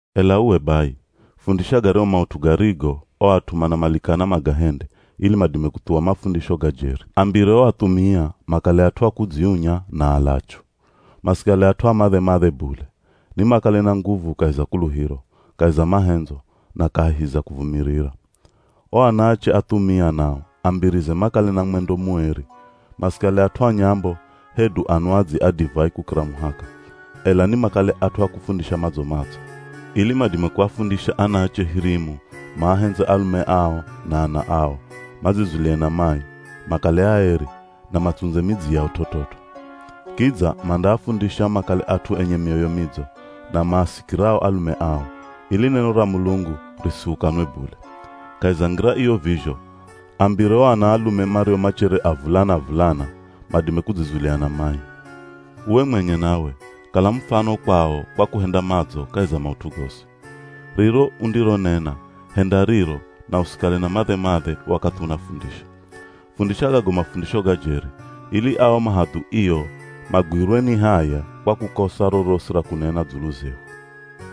Ela uwe bai, fundisha garyahu maut'u garigo o at'u manamalikana magahende ili madime kuthuwa mafundisho ga jeri. Ambire o athumia makale at'u a kudziunya na alachu. Masikale at'u a madhe-madhe bule, nimakale na nguvu kahi za kuluhiro, kahi za mahendzo na kahi za kuvumirira. O anaache athumia nao ambirize makale na mwendo mueri. Masikale at'u a nyambo hedu anwadzi a divai kukira muhaka, ela nimakale at'u a kufundisha madzo-madzo, ili madime kuafundisha anaache hirimu maahendze alume ao na ana ao, madzizulie na mai, makale aeri, na matsundze midzi yao t'ot'ot'o. Kidza mandaafundisha makale at'u enye mioyo midzo, na maasikirao alume ao, ili neno ra Mulungu risihukanwe bule. Kahi za ngira iyo vizho, ambire o anaalume mario machere avulana-avulana madime kudzizulia na mai. Uwe mwenye nawe, kala mufano kwao kwa kuhenda madzo kahi za maut'u gosi. Riro undironena, henda riro na usikale na madhe-madhe wakathi unafundisha. Fundisha gago mafundisho ga jeri, ili ao mahadhuio magwirwe ni haya kwa kukosa rorosi ra kunena dzulu zehu.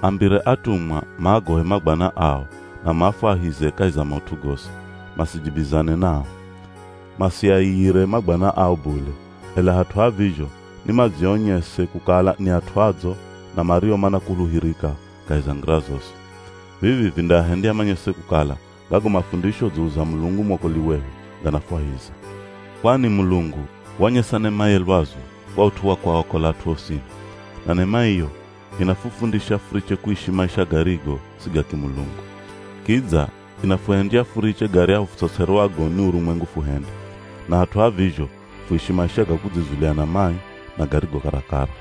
Ambire atumwa maagohe mabwana ao na maafwahize kahi za maut'u gosi, masijibizane nao. Masiaiyire mabwana ao bule, ela hat'u ha vizho ni madzionyese kukala ni at'u adzo na mario manakuluhirika kahi za ngira zosi. Vivi vindaahendya manyese kukala gago mafundisho dzulu za Mulungu mwokoli wehu ganafwahiza. Kwani Mulungu wanyesa nemaye lwazu kwa ut'u wa kuakola at'u osini. Na nema iyo, inafufundisha furiche kuishi maisha garigo si ga kimulungu. Kidza inafuhendya furiche garyahu futs'ots'erwago ni urumwengu fuhende, na hat'u ha vizho fuishi maisha ga kudzizulia na mai, na garigo karakara.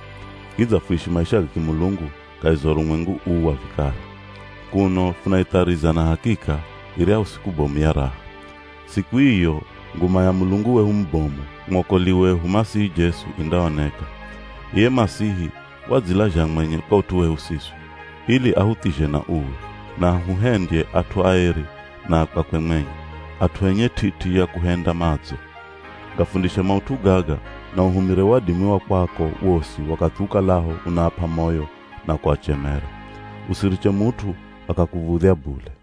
Kidza fuishi maisha ga kimulungu kahi za urumwengu uu wa vikara, kuno funaithariza na hakika iryahu siku bomu ya raha. Siku iyo nguma ya Mulungu wehu mubomu, mwokoli wehu Masihi Jesu indaoneka. Iye Masihi wadzilazha mwenye kwa ut'u wehu siswi, ili ahuthizhe na uwi, na ahuhendye at'u aeri na a kwakwe mwenye, at'u enye t'it'i ya kuhenda madzo. Gafundishe maut'u gaga na uhumire wadimi wa kwako wosi wakathi ukalaho unaap'a moyo na kuachemera. Usiriche mut'u akakuv̱udhya bule.